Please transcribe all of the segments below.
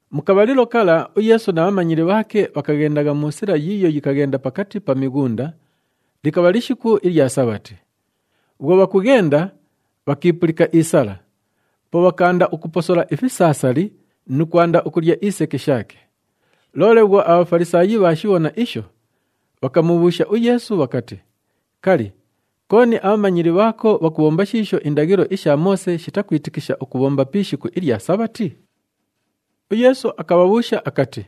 Mu kabhalilo kala, uYeesu na bhamanyili bhaake bhakaghendagha mu sila yiiyo yikaghenda pakati pa mighunda, likabha lishiku ilya Sabhati. Bhwo bhakughenda, bhakiipulika isala. Po bhakaanda ukuposola ifisaasali nu kwanda ukulya iseke shaake. Loole bhwo aBhafalisaayi bhaashibhona isho, bhakamubhuusha uYeesu bhakati, “Kali, kooni abhamanyili bhaako bhakubhomba shiisho indaghilo isha Moose shitakwitikisha ukubhomba pi ishiku ilya Sabhati?” UYeesu akabhabhuusha akati,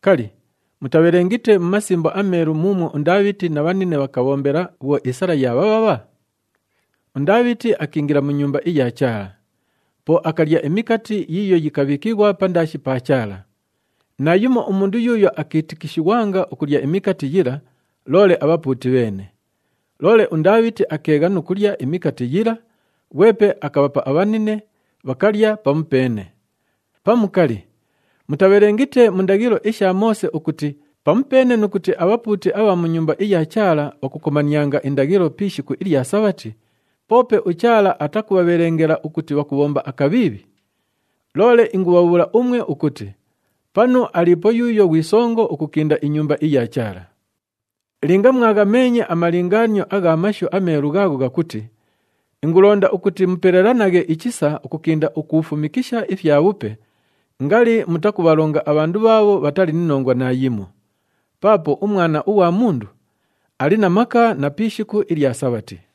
“Kali, mutabhelengite mu Masimbo aMeelu muumwo uNdaabhiti na bhanine bhakabhombela bhwo isala yaabhabhabha? UNdaabhiti akiingila mu Nyumba iya Chaala. Po akalya imikati yiiyo yikabhiikighwa pandaashi pa Chaala. Naayumo umundu yuuyo akiitikishighwanga ukulya imikati yila, loole abhapuuti bheene. Loole uNdaabhiti akeegha nu kulya imikati yila, ghwepe akabhapa abhanine, bhakalya pamupeene. Pamu kali, mutabhelengite mu ndaghilo isha Moose ukuti pamupeene nu kuti abhapuuti abha mu Nyumba iya Chaala bhakukomanianga indaghilo pi ishiku ilya Sabhati, poope uChaala atakubhabhelengela ukuti bhakubhomba akabhiibhi? Loole ingubhabhuula umwe ukuti panu aliipo yuuyo ghwi songo ukukinda iNyumba iya Chaala. Linga mwaghameenye amalingaanio agha Mashu aMeelu ghaagho ghakuti, ‘Ingulonda ukuti mupelelanaghe ichisa ukukinda ukuufumikisha ifyabhupe,’ ngali mutakubhalonga abhandu bhaabho bhatali ni nongwa naayimo. Paapo uMwana ughwa Mundu ali na maka na pi ishiku ilya Sabhati.”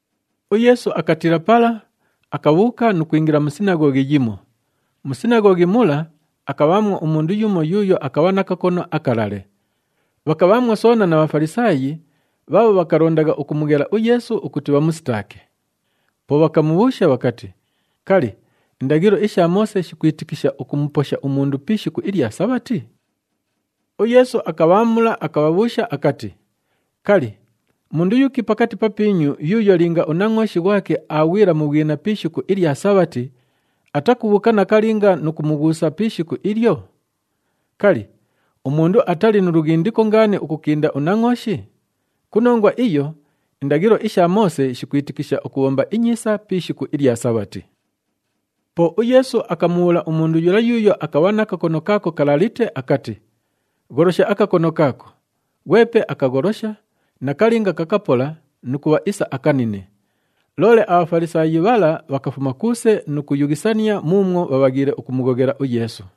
UYeesu akatiila pala, akabhuuka nu kwingila mu sinaghoghi yimo. Mu sinaghoghi mula, akabhaamwo umundu yumo yuuyo akabha na kakono akalale. Bhakabhaamwo soona na Bhafalisaayi bhaabho bhakalondagha ukumughela uYeesu ukuti bhamusitaake. Po bhakamubhuusha bhakati, “Kali, indaghilo isha Moose shikwitikisha ukumuposha umundu pi ishiku ilya Sabhati?” UYeesu akabhaamula, akabhabhuusha akati, “Kali, mundu yuki pakati papiinyu yuuyo linga unangʼooshi ghwake aaghwila mu bhwina pi ishiku ilya Sabhati, atakubhuuka nakalinga nu kumughuusa pi ishiku ilyo? Kali, umundu atali nu lughindiko ngaani ukukinda unangʼooshi? Ku nongwa iyo, indaghilo isha Moose shikwitikisha ukubhomba inyiisa pi ishiku ilya Sabhati.” Po uYeesu akamubhuula umundu yula yuuyo akabha na kakono kaako kalalite akati, “Gholosha akakono kaako.” Ghwepe akagholosha, nakalinga kakapola nu kubha isa akanine. Loole aBhafalisaayi bhala bhakafuma kuuse nu kuyughisania muumwo bhabhaghiile ukumughoghela uYeesu.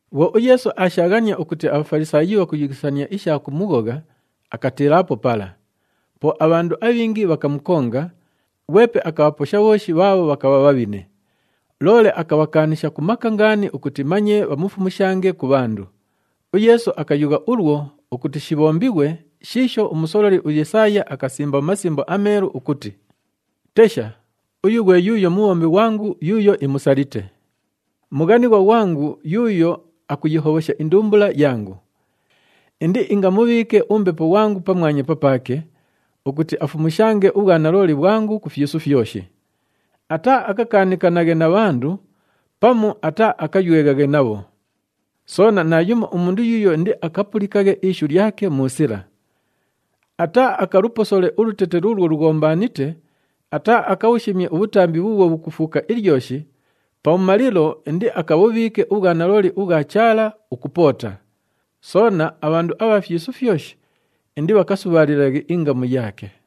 Bhwo uYeesu aashaaghania ukuti aBhafalisaayi bhakuyughisania isha kumughogha, akatiilaapo pala. Po abhandu abhingi bhakamukonga, ghwepe akabhaposha bhooshi bhaabho bhakabha bhabhine. Loole akabhakaanisha ku maka ngaani ukuti manye bhamufumushange ku bhandu. UYeesu akayugha ulwo ukuti shibhombighwe shiisho umusololi uYesaaya akasimba mu Masimbo aMeelu ukuti, “Tesha, uyu ghwe yuuyo mubhombi ghwangu yuuyo imusalite, mughanighwa ghwangu, yuuyo akuyihobhosha indumbula yangu. Indiingamubhiike uMbepo ghwangu pamwanya papaake, ukuti afumushange ubhwanalooli bhwangu ku fyisu fyoshi. Ataaakakaanikanaghe na bhandu pamu ataaakayweghaghe nabho. Soona naayumo umundu yuuyo indiakapulikaghe ishu lyake mu sila. Ataaakaluposole ulutete luulwo lughombaanite, ataaakabhushimye ubhutambi bhuubhwo bhukufuuka ilyoshi, pabhumalilo indiakabhubhiike ubhwanalooli ubhwa Chaala ukupoota. Soona, abhandu abha fyisu fyoshi, indibhakasubhaalilaghe ingamu yaake.”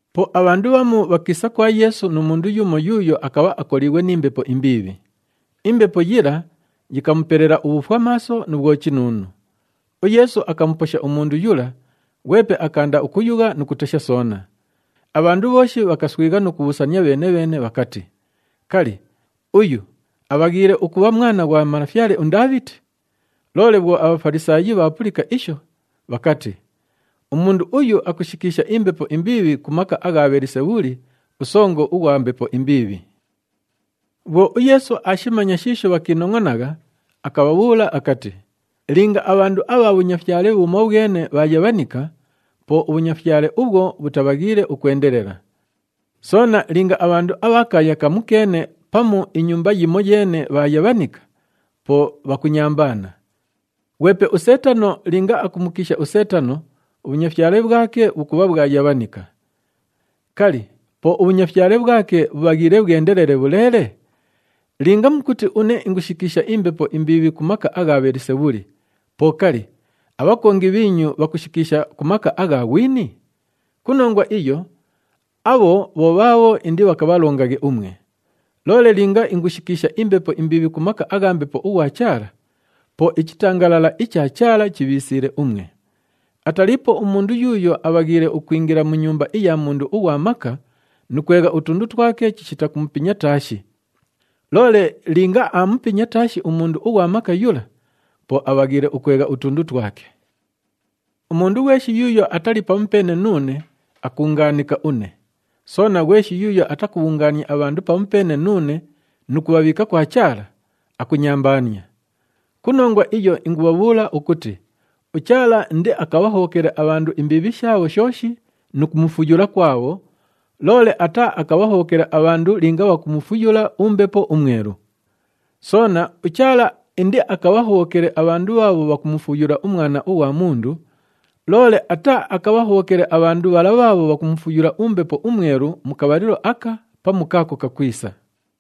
Po abhandu bhamu bhakiisa kwa Yeesu nu mundu yumo yuuyo akabha akoliighwe ni mbepo imbiibhi. Imbepo yila yikamupelela ubhufwamaaso nu bhwochinuunu. UYeesu akamuposha umundu yula, ghwepe akaanda ukuyugha nu kutesha soona. Abhandu bhooshi bhakaswigha nu kubhuusania bheene-bheene bhakati, “Kali, uyu abhaghiile ukubha Mwana ghwa malafyale uNdaabhiti?” Loole bhwo aBhafalisaayi bhaapulika isho, bhakati, “Umundu uyu akushikiisha imbepo imbiibhi ku maka agha Bhelisebhuli, usongo ughwa mbepo imbiibhi.” Bhwo uYeesu aashimanya shiisho bhakiinongʼonagha, akabhabhuula akati, “Linga abhandu abha bhunyafyale bhumobhwene bhaayabhanika, po ubhunyafyale ubhwo bhutabhaghiile ukwendelela. Soona linga abhandu abha kaaya kamukeene pamu inyumba yimoyeene bhaayabhanika, po bhakunyambaana. Ghwepe uSeetano linga akumukiisha uSeetano, ubhunyafyale bhwake bhukubha bhwayabhanika. Kali, po ubhunyafyale bhwake bhubhaghiile bhwendelele bhuleele? Linga mukuti une ingushikiisha imbepo imbiibhi ku maka agha Bhelisebhuli, po kali, abhakongi bhiinyu bhakushikiisha ku maka agha ghwini? Ku nongwa iyo, abho bho bhaabho indibhakabhalongaghe umwe. Loole linga ingushikiisha imbepo imbiibhi ku maka agha Mbepo ughwa Chaala, po ichitangalala icha Chaala chibhiisiile umwe. Ataliipo umundu yuuyo abhaghiile ukwingila mu nyumba iya mundu ughwa maka nu kwegha utundu twake chishita kumupinya taashi. Loole linga aamupinya taashi umundu ughwa maka yula, po abhaghiile ukwegha utundu twake. “Umundu ghweshi yuuyo atali pamupeene nuune, akuungaanika une. Soona, ghweshi yuuyo atakubhungaania abhandu pamupeene nuune nu kubhabhiika kwa Chaala, akunyambaania. Ku nongwa iyo ingubhabhuula ukuti uChaala indiakabhahobhokele abhandu imbiibhi shaabho shooshi nu kumufuyula kwabho, loole ataaakabhahobhokele abhandu linga bhakumufuyula uMbepo uMwelu. Soona, uChaala indiakabhahobhokele abhandu bhaabho bhakumufuyula uMwana ughwa Mundu, loole ataaakabhahobhokele abhandu bhala bhaabho bhakumufuyula uMbepo uMwelu mu kabhalilo aka pamu kaako kakwisa.”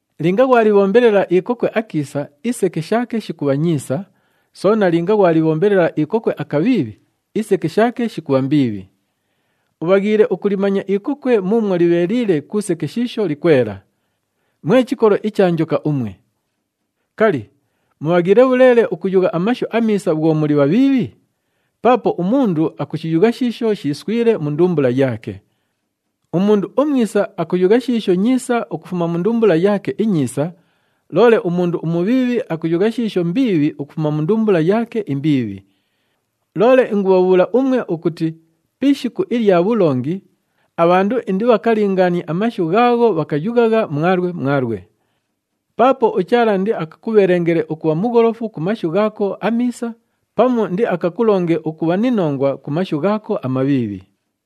“Linga ghwalibhombelela ikokwe akiisa, iseke shaake shikubha nyiisa, soona linga ghwalibhombelela ikokwe akabhiibhi, iseke shaake shikubha mbiibhi. Ubhaghiile ukulimanya ikokwe muumwo libheeliile ku seke shiisho likwela. Mwe chikolo icha njoka umwe! Kali, mubhaghiile bhuleele ukuyugha amashu amiisa bhwo muli bhabhiibhi? Paapo umundu akushiyugha shiisho shiiswile mu ndumbula yaake. Umundu umwisa akuyugha shiisho nyiisa ukufuma mu ndumbula yaake inyiisa, loole umundu umubhiibhi akuyugha shiisho mbiibhi ukufuma mu ndumbula yaake imbiibhi. Loole ingubhabhuula umwe ukuti pi ishiku ilya bhulongi, abhandu indibhakalingaanie amashu ghaagho bhakayughagha mwalwe mwalwe. Paapo uChaala indiakakubhelengele ukubha mugholofu ku mashu ghaako amiisa pamu indiakakulonge ukubha ni nongwa ku mashu ghaako amabhiibhi.”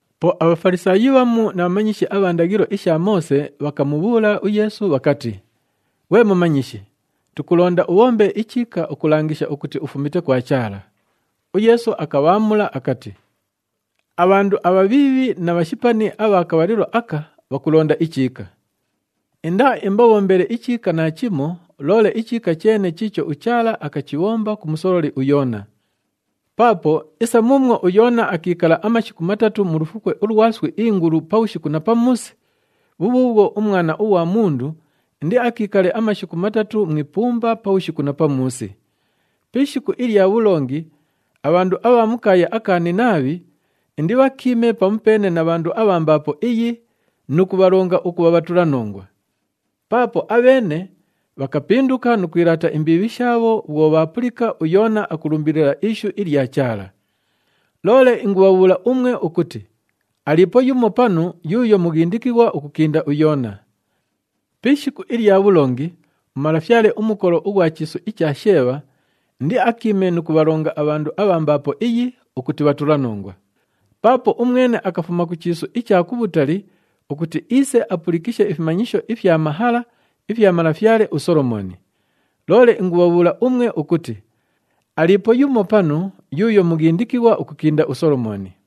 Po aBhafalisaayi bhamu na bhamanyishi abha ndaghilo isha Moose bhakamubhuula uYeesu bhakati, “Ghwe Mumanyishi, tukulonda ubhombe ichiika ukulangisha ukuti ufumite kwa Chaala.” UYeesu akabhaamula akati, “Abhandu abhabhiibhi na bhashipani abha kabhalilo aka bhakulonda ichiika! Indaaimbabhombele ichiika naachimo, loole ichiika cheene chiicho uChaala akachibhomba ku musololi uYoona. Paapo isa muumwo uYoona akiikala amashiku matatu mu lufukwe ulwa iswi ingulu pabhushiku na pamuusi, bhubhuubhwo uMwana ughwa Mundu indiakiikale amashiku matatu mu ipumba pabhushiku na pamuusi. Pi ishiku ilya bhulongi abhandu abha mu kaaya aka Ninaabhi indibhakiime pamupeene na bhandu abha mbaapo iyi nu kubhalonga ukubha bhatulanongwa. Paapo abheene bhakapinduka nu kwilaata imbiibhi shaabho bhwo bhaapulika uYoona akulumbilila ishu ilya Chaala. Loole ingubhabhuula umwe ukuti aliipo yumo panu yuuyo mughindikighwa ukukinda uYoona. Pi ishiku ilya bhulongi umalafyale umukolo ughwa chiisu icha Sheebha indiakiime nu kubhalonga abhandu abha mbaapo iyi ukuti bhatulanongwa. Paapo umwene akafuma ku chiisu icha kubhutali ukuti iise apulikishe ifimanyisho ifya mahala ifya malafyale uSolomooni. Loole ingubhabhuula umwe ukuti aliipo yumo panu yuuyo mughindikighwa ukukinda uSolomooni.”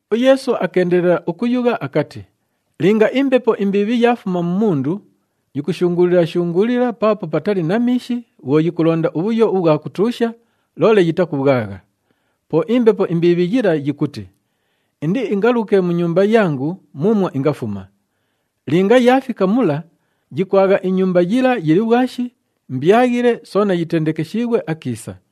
UYeesu akeendelela ukuyugha akati, “Linga imbepo imbiibhi yaafuma mu mundu, yikushunguulila-shunguulila paapo patali na miishi bhwo yikulonda ubhuyo ubhwa kutuusha, loole yitakubhwagha. Po imbepo imbiibhi yila yikuti, ‘Indiingaluke mu nyumba yangu muumwo ingafuma.’ Linga yaafika mula, yikwagha inyumba yila yili bhwashi, mbyaghile soona yitendekeshiighwe akiisa.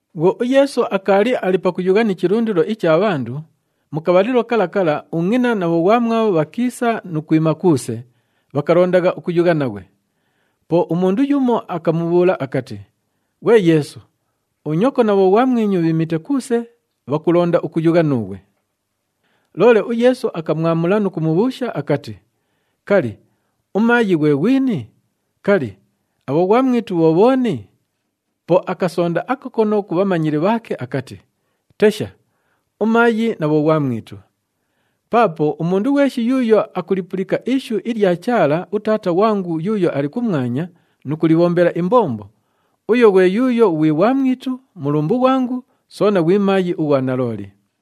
Bhwo uYeesu akaali ali pakuyugha ni chilundilo icha bhandu, mu kabhalilo kala kala ungʼina na bhoghwamwabho bhakiisa nu kwima kuuse, bhakalondagha ukuyugha naghwe. Po umundu yumo akamubhuula akati, “Ghwe Yeesu, unyoko na bhoghwamwinyu bhiimite kuuse, bhakulonda ukuyugha nuughwe.” Loole uYeesu akamwamula nu kumubhuusha akati, “Kali, umaayi ghwe ghwini? Kali, abhoghwamwitu bho bhooni?” Po akasonda akakono ku bhamanyili bhaake akati, “Tesha, umaayi na bhoghwamwitu! Paapo umundu ghweshi yuuyo akulipulika ishu ilya Chaala, uTaata ghwangu yuuyo ali kumwanya nu kulibhombela imbombo, uyo ghwe yuuyo ghwi ghwamwitu, mulumbu ghwangu soona ghwi maayi ughwa nalooli.”